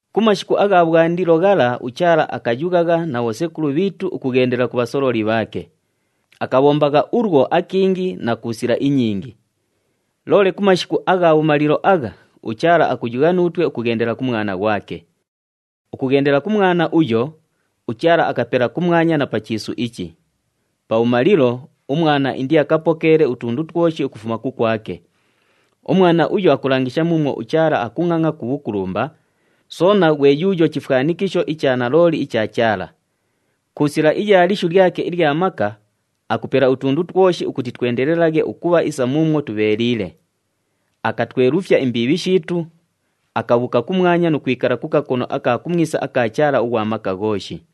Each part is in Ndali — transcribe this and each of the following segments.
Ku mashiku agha bhwandilo ghala uChaala akayughagha na bhosekulu bhiitu ukughendela ku bhasololi bhaake. Akabhombagha ulwo akingi na ku sila inyingi. Loole ku mashiku agha bhumalilo agha, uChaala akuyugha nuutwe ukughendela ku Mwana ghwake. Ukughendela ku Mwana uyo, uChaala akapela kumwanya na pa chiisu ichi. Pabhumalilo, uMwana indiakapokeele utundu twoshi ukufuma kukwake. UMwana uyo akulangisha muumwo uChaala akungʼangʼa ku bhukulumba, soona ghwe yuuyo chifwanikisho icha nalooli icha Chaala. Ku sila iya lishu lyake ilya maka, akupela utundu twoshi ukuti twendelelaghe ukubha isa muumwo tubheeliile. Akatwelufya imbiibhi shiitu, akabhuuka kumwanya nu kwikala ku kakono aka kumwisa aka Chaala ughwa Maka Ghooshi.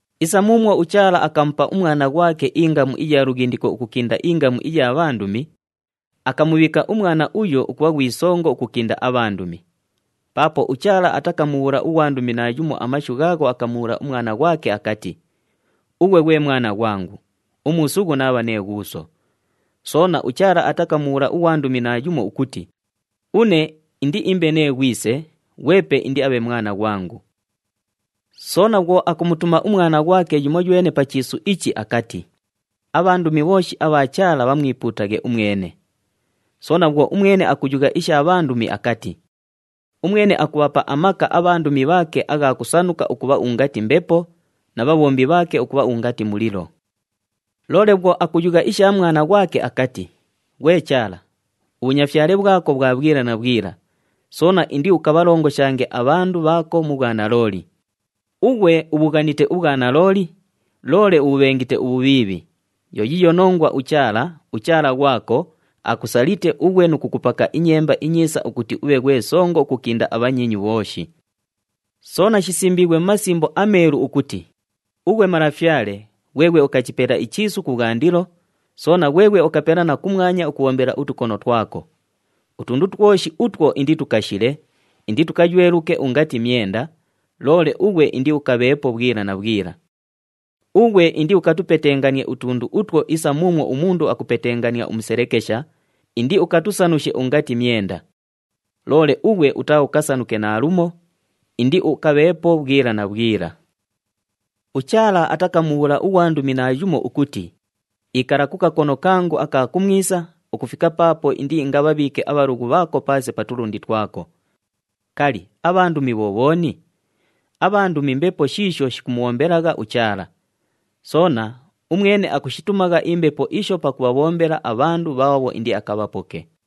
Isa muumwo uChaala akamupa uMwana ghwake ingamu iya lughindiko ukukinda ingamu iya bhandumi, akamubhiika uMwana uyo ukubha ghwi Songo ukukinda abhandumi. Paapo uChaala atakamubhuula ughwandumi naayumo amashu ghaagho akamubhuula uMwana ghwake akati, “Ughwe ghwe Mwana ghwangu, umuusughu naabha nee Ghuuso.” Soona, uChaala atakamubhuula ughwandumi naayumo ukuti, “Une indiimbe nee Ghwise, ghwepe indiabhe Mwana ghwangu.” Soona bhwo akumutuma uMwana ghwake yumoywene pa chiisu ichi, akati, “Abhandumi bhooshi abha Chaala bhamwipuutaghe umwene.” Soona bhwo umwene akuyugha isha bhandumi akati, “Umwene akubhapa amaka abhandumi bhaake agha kusanuka ukubha ungati mbepo na bhabhombi bhaake ukubha ungati mulilo.” Loole bhwo akuyugha isha Mwana ghwake akati, “Ghwe Chaala, ubhunyafyale bhwako bhwa bhwila na bhwila, soona indiukabhalongoshange abhandu bhaako mu bhwanalooli. Ughwe ubhughanite ubhwanalooli, loole ubhubhengite ubhubhiibhi. Yo yiiyo nongwa uChaala, uChaala ghwako, akusalite ughwe nu kukupaka inyemba inyiisa ukuti ubhe ghwe Songo ukukinda abhanyiinyu bhooshi.” Soona shisimbiighwe mu Masimbo aMeelu ukuti, “Ughwe Malafyale, ghweghwe ukachipela ichiisu kubhwandilo, soona ghweghwe ukapela na kumwanya ukubhombela utukono twako. Utundu twoshi utwo inditukashile, inditukayweluke ungati myenda, loole ughwe indiukabheepo bhwila na bhwila. Ughwe indiukatupetenganie utundu utwo isa muumwo umundu akupetekengania umuselekesha, indiukatusanushe ungati myenda. Loole ughwe utaaukasanuke naalumo, indiukabheepo bhwila na bhwila.” UChaala atakamubhuula ughwandumi naayumo ukuti, “Ikala ku kakono kangu aka kumwisa, ukufika paapo indiingabhabhiike abhalughu bhaako paase pa tulundi twako.” Kali, abhandumi bho bhooni? Abhandumi mbepo shiisho shikumubhombelagha uChaala. Soona, umwene akushitumagha imbepo isho pakubhabhombela abhandu bhaabho indiakabhapoke.